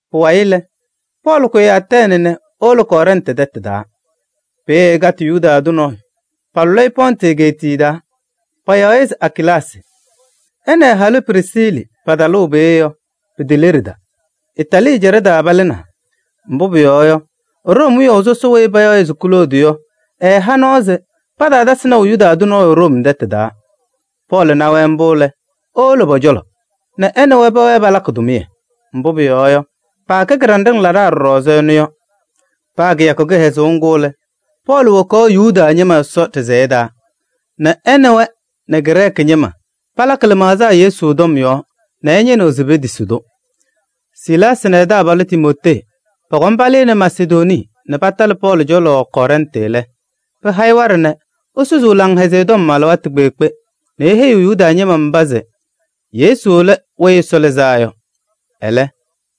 Pʋwayɩ lɛ, Pɔɔlɩ kʋyɩ Atɛɛnɩ nɛ ewolo Kɔrɛntɩ tɛtʋ taa. Peeye ɛkatɩ Yuda tʋ nɔɔyʋ, palʋlɩ-ɩ Pɔntɩ egeetiye taa. Payaɣ-ɩ se Akilaasɩ. Ɛ nɛ ɛ-halʋ Prisiili patalʋʋ peeye yɔ, piteleɖida. Itaalii ɛjaɖɛ taa palɩnaa, mbʋ pʋyɔɔ yɔ, Room wiyaʋ sɔsɔ weyi payaɣ se Kloodi yɔ ɛɛha nɔɔ se pataatasɩ naʋ Yuda tʋ nɔɔyʋ Room tɛtʋ taa. Pɔɔlɩ na-wɛ mbʋ lɛ, ewolo pɔ-cɔlɔ nɛ ɛ nɛ wɛ pɛwɛɛ nɛ palakɩ tʋmɩyɛ. Mbʋ pʋyɔɔ yɔ, paakɛ kɩɖanɖɩŋ laɖaa ɖɔɖɔ ɛzɩ ɛnʋ yɔ. Paa kɩyakʋ kɩhɛzʋʋ ŋgʋ lɛ, Pɔɔlɩ wokaɣ Yuda ñɩma Ɛsɔ ɖɩsɛyɛ taa nɛ ɛ nɛ wɛ nɛ Grɛɛkɩ ñɩma palakɩ lɩmaɣza Yesu tɔm yɔɔ nɛ ɛñɩnɩɣ se petisi-tʋ. Silaasɩ nɛ ɛ-taabalʋ Timootee pɔkɔm palɩnɩ Masedonii nɛ patalɩ Pɔɔlɩ cɔlɔ Kɔrɛntɩ lɛ, pɩha-ɩ waɖɛ nɛ esusuu Laŋhɛzɩyɛ Tɔm alɩwaatʋ kpeekpe nɛ eheyiɣ Yuda ñɩma mba se Yesu lɛ Weyi Ɛsɔ Lɩzaa Yɔ. Ɛlɛ,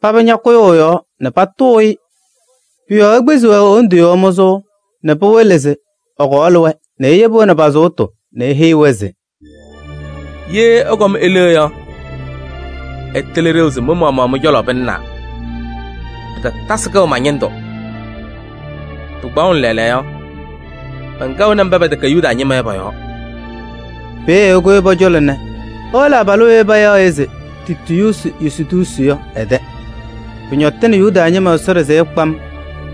paba ñakʋyʋʋ ɛ-yɔɔ nɛ patʋʋ-ɩ. Pʋ-yɔɔ ekpizi-wɛ e-wondu yɔɔ mʋzʋʋ nɛ pɩwɩlɩ se ɛkɔɔlɩ-wɛ nɛ eyebi-wɛ nɛ pa-sʋʋtʋ nɛ eheyi-wɛ se: “Ye ɩkɔm ile yɔ, ɩtɩlɩ ɖeu se mɩ-maɣmaɣ mɩ-cɔlɔ pɩlɩnaa, pɩtatasɩ kɛʋ ma-ñɩndʋ. Pɩkpaɣʋnɩ lɛɛlɛɛyɔ yɔ, mɛnkɛɣnɩ mba pɛtɛkɛ Yuda ñɩma yɔ pɔ-yɔɔ.” Peeye ɛkʋyɩ pɔ-cɔlɔ nɛ ewolo abalʋ weyi payaɣ se Tiitiyuusi Yustuusi yɔ ɛ-tɛ. Pɩɩñɔtɩnɩ Yuda ñɩma Ɛsɔ ɖɩsɛyɛ kpam,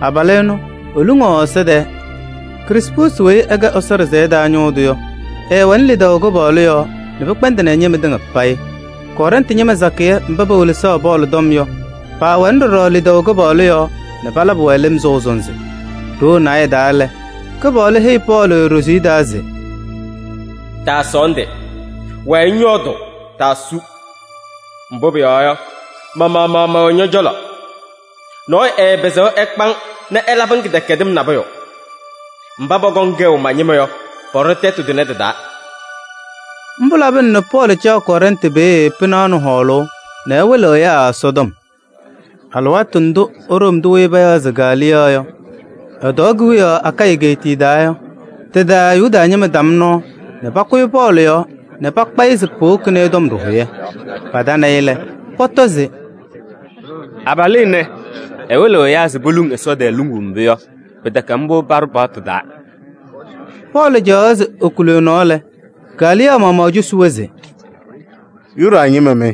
abalʋ ɛnʋ eluŋaɣ Ɛsɔ tɛɛ. Krispuusi weyi ɛkɛ Ɛsɔ ɖɩsɛyɛ taa ñʋʋ tʋ yɔ, ɛɛwɛnɩ lidaʋ Kɩpaɣlʋ yɔɔ nɛ pɩkpɛndɩnɩ ɛ-ñɩma tɩŋa payɩ. Kɔrɛntɩ ñɩma sakɩyɛ mba pewelesaɣ Pɔɔlɩ tɔm yɔ, paawɛnɩ ɖɔɖɔ lidaʋ Kɩpaɣlʋ yɔɔ nɛ palabɩ-wɛ lɩm sɔʋ sɔnzɩ. Ɖoo naayɛ taa lɛ, Kɩpaɣlʋ heyi Pɔɔlɩ ɖoziye taa se: “Taasɔɔndɩ, wɛɛ ŋyɔɔdʋʋ, taasu. Mbʋ pʋyɔɔ yɔ, ma-maɣmaɣ mɛwɛ ñɔ-cɔlɔ. Nɔɔyʋ ɛɛpɩzɩɣ ɛkpa-ŋ nɛ ɛlabɩ-ŋ kɩdɛkɛdɩm nabʋyʋ. Mba pɔkɔŋ kɛʋ ma-ñɩma yɔ, pɔɖɔ tɛtʋ tʋnɛ tɩ-taa.” Mbʋ labɩna nɛ Pɔɔlɩ caɣ Kɔrɛntɩ peeye pɩnaɣ nɛ hɔɔlʋʋ nɛ ɛwɩlɩɣ ɛyaa Ɛsɔtɔm. Alɩwaatʋ ndʋ Room tʋ weyi payaɣ se Galiyɔɔ yɔ ɛtɔɔ kewiyaɣ Akayɩ egeetiye taa yɔ, tɩ-taa Yuda ñɩma tam nɔɔ nɛ pakʋyɩ Pɔɔlɩ yɔɔ nɛ pakpa-ɩ se powokini-i tɔm ɖɩhʋyɛ. Patanɩ-ɩ lɛ, pɔtɔ se: “Abalʋ ɛnɛ, ɛwɩlɩɣ ɛyaa se poluŋ Ɛsɔ tɛɛ luŋuu mbʋ yɔ, pɩtɛkɛ mbʋ paɖʋ paɣtʋ taa.” Pɔɔlɩ caɣaɣ se ekuli ɛ-nɔɔ lɛ, Galiyɔɔ maɣmaɣ cosi-wɛ se: “Yuda ñɩma mɩ!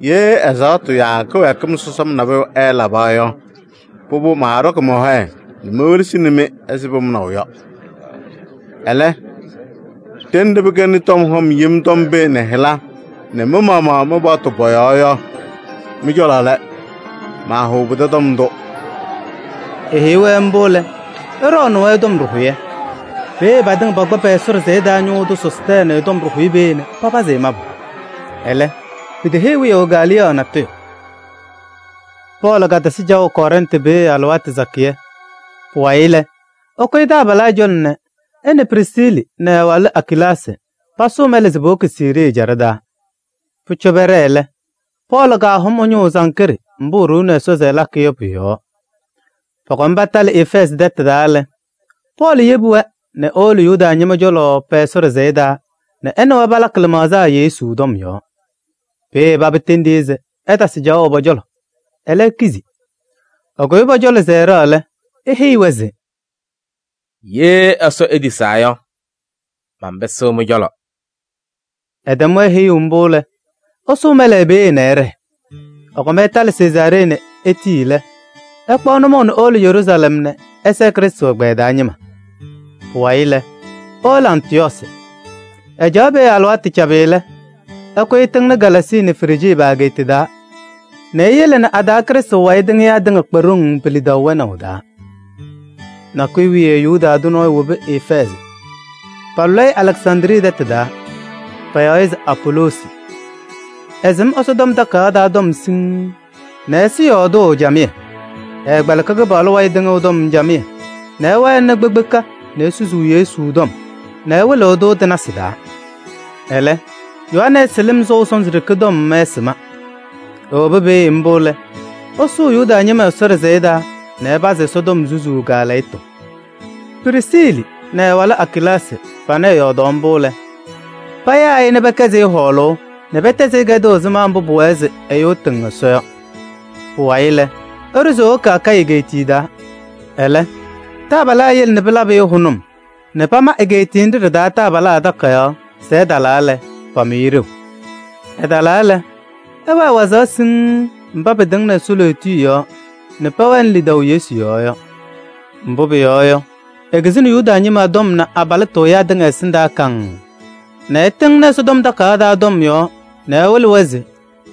Ye ɛzaɣtʋ yaa kɩwɛɛkɩm sɔsɔm nabʋyʋ ɛɛlaba yɔ, pʋbʋ, maaɖɔkɩ mɔ-hɔyɛ nɛ mewelesini-mɩ ɛzɩ pʋmʋnaʋ yɔ. Ɛlɛ, ɖenɖe pɩkɛnɩ tɔm hɔm yem tɔm pee nɛ hɩla nɛ mɩ-maɣmaɣ mɩ-paɣtʋ pɔ-yɔɔ yɔ, mɩ-cɔlɔ lɛ. Maahʋʋ pɩtɛ tɔm ndʋ!” Eheyi-wɛ mbʋ lɛ, ɛɖɔɔnɩ-wɛ tɔm ɖɩhʋyɛ. Peeye patɩŋa pakpa pɛ-Ɛsɔ ɖɩsɛyɛ taa ñʋʋ tʋ Sɔstɛɛnɩ tɔm ɖɩhʋyɛ peeye nɛ papazɩ-ɩ mabʋ. Ɛlɛ, piteheyi wiyaʋ Galiyɔɔ natʋyʋ. Pɔɔlɩ katasɩ caɣʋ Kɔrɛntɩ peeye alɩwaatʋ sakɩyɛ. Pʋwayɩ lɛ, ɛkʋyɩ taabalaa cɔlɔ nɛ ɛ nɛ Prisiili nɛ ɛ-walʋ Akilaasɩ pasʋʋ mɛlɛ se powoki Siirii ɛjaɖɛ taa. Pʋcɔ pɛɖɛɛ lɛ, Pɔɔlɩ kahʋm ɛ-ñʋʋ Sankree mbʋ eɖuuni Ɛsɔ se ɛlakɩ yɔ pʋ-yɔɔ. Pɔkɔm patalɩ Efɛɛzɩ tɛtʋ taa lɛ, Pɔɔlɩ yebi-wɛ nɛ ewolo Yuda ñɩma cɔlɔ pɛ-Ɛsɔ ɖɩsɛyɛ taa nɛ ɛ nɛ wɛ palakɩ lɩmaɣza Yesu tɔm yɔɔ. Peeye paba tendi-i se ɛtasɩ caɣʋ pɔ-cɔlɔ. Ɛlɛ, ekizi. Ɛkʋyɩ pɔ-cɔlɔ se ɛɖɛɣ lɛ, eheyi-wɛ se: “Ye Ɛsɔ etisaa yɔ, manpɩsɩɣ mɩ-cɔlɔ.” Ɛtɛm-wɛ heyuu mbʋ lɛ, ɛsʋʋ mɛlɛ peeye nɛ ɛɖɛɛ. Ɛkɔm ɛtalɩ Sezaaree nɛ etii lɛ, ɛkpaɣ nʋmɔʋ nɛ ewolo Yeruusalɛm nɛ ɛsɛɛ Krɩstʋ ɛgbɛyɛ taa ñɩma. Pʋwayɩ lɛ, ewolo Antɩyɔɔsɩ. Ɛcaɣ peeye alɩwaatʋ cabɩ lɛ, ɛkʋyɩ ɛtɩŋnɩ Galaasii nɛ Frijii pa-egeeta taa nɛ eyele nɛ a-taa Krɩstʋ wayɩ tɩŋɩyaa tɩŋa kpa ɖoŋ pe-lidaʋ wɛnaʋ taa. Nakʋyʋ wiye Yuda tʋ nɔɔyʋ wobi Efɛɛzɩ. Paalʋlɩ-ɩ Alɛksandrii tɛtʋ taa, payaɣ-ɩ se Apoloosi. Ɛsɩm Ɛsɔtɔm Takayaɣ taa tɔm siŋŋ nɛ ɛsɩ yɔɔdʋʋ camɩyɛ. Ɛɛkpɛlɩkɩ Kɩpaɣlʋ wayɩ tɩŋʋʋ tɔm camɩyɛ nɛ ɛwɛnɩ kpekpeka nɛ esusuu Yesu tɔm nɛ ɛwɩlɩɣ-tʋ tɩ-nasɩ taa. Ɛlɛ, Yohanɛɛsɩ lɩm sɔʋ sɔnzɩ ɖeke tɔm ɛɛsɩma. Ewobi peeye mbʋ lɛ, ɛsʋʋ Yuda ñɩma Ɛsɔ ɖɩsɛyɛ taa nɛ ɛpazɩ Ɛsɔtɔm susuu kaalɛyɩtʋ. Prisiili nɛ ɛ-walʋ Akilaasɩ panɩ ɛyɔɔdaɣ mbʋ lɛ, payaa-ɩ nɛ pɛkɛzɩ-ɩ hɔɔlʋʋ nɛ pɛtɛzɩ-ɩ kɛdʋʋ ɛzɩma mbʋ pʋwɛɛ se ɛyʋ ɛtɩŋ Ɛsɔ yɔ. Pʋwayɩ lɛ, ɛɖʋ se ewoki Akayɩ egeetiye taa. Ɛlɛ taabalaa yele nɛ pɩlabɩ-ɩ hʋnʋm nɛ pama egeetiye nɖɩ ɖɩ-taa taabalaa takayaɣ se ɛtalaa lɛ, pamʋ-ɩ ɖeu. Ɛtalaa lɛ, ɛwɛɛ wazaɣ siŋŋ mba pɩtɩŋnɩ Ɛsɔ lootiye yɔɔ nɛ pɛwɛnɩ lidaʋ Yesu yɔɔ yɔ. Mbʋ pʋyɔɔ yɔ, ekizini Yuda ñɩma tɔm nɛ abalɩtʋ ɛyaa tɩŋa ɛsɩndaa kaŋŋ nɛ ɛtɩŋnɩ Ɛsɔtɔm Takayaɣ taa tɔm yɔɔ nɛ ɛwɩlɩ-wɛ se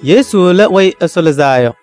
Yesu lɛ Weyi Ɛsɔ Lɩzaa Yɔ.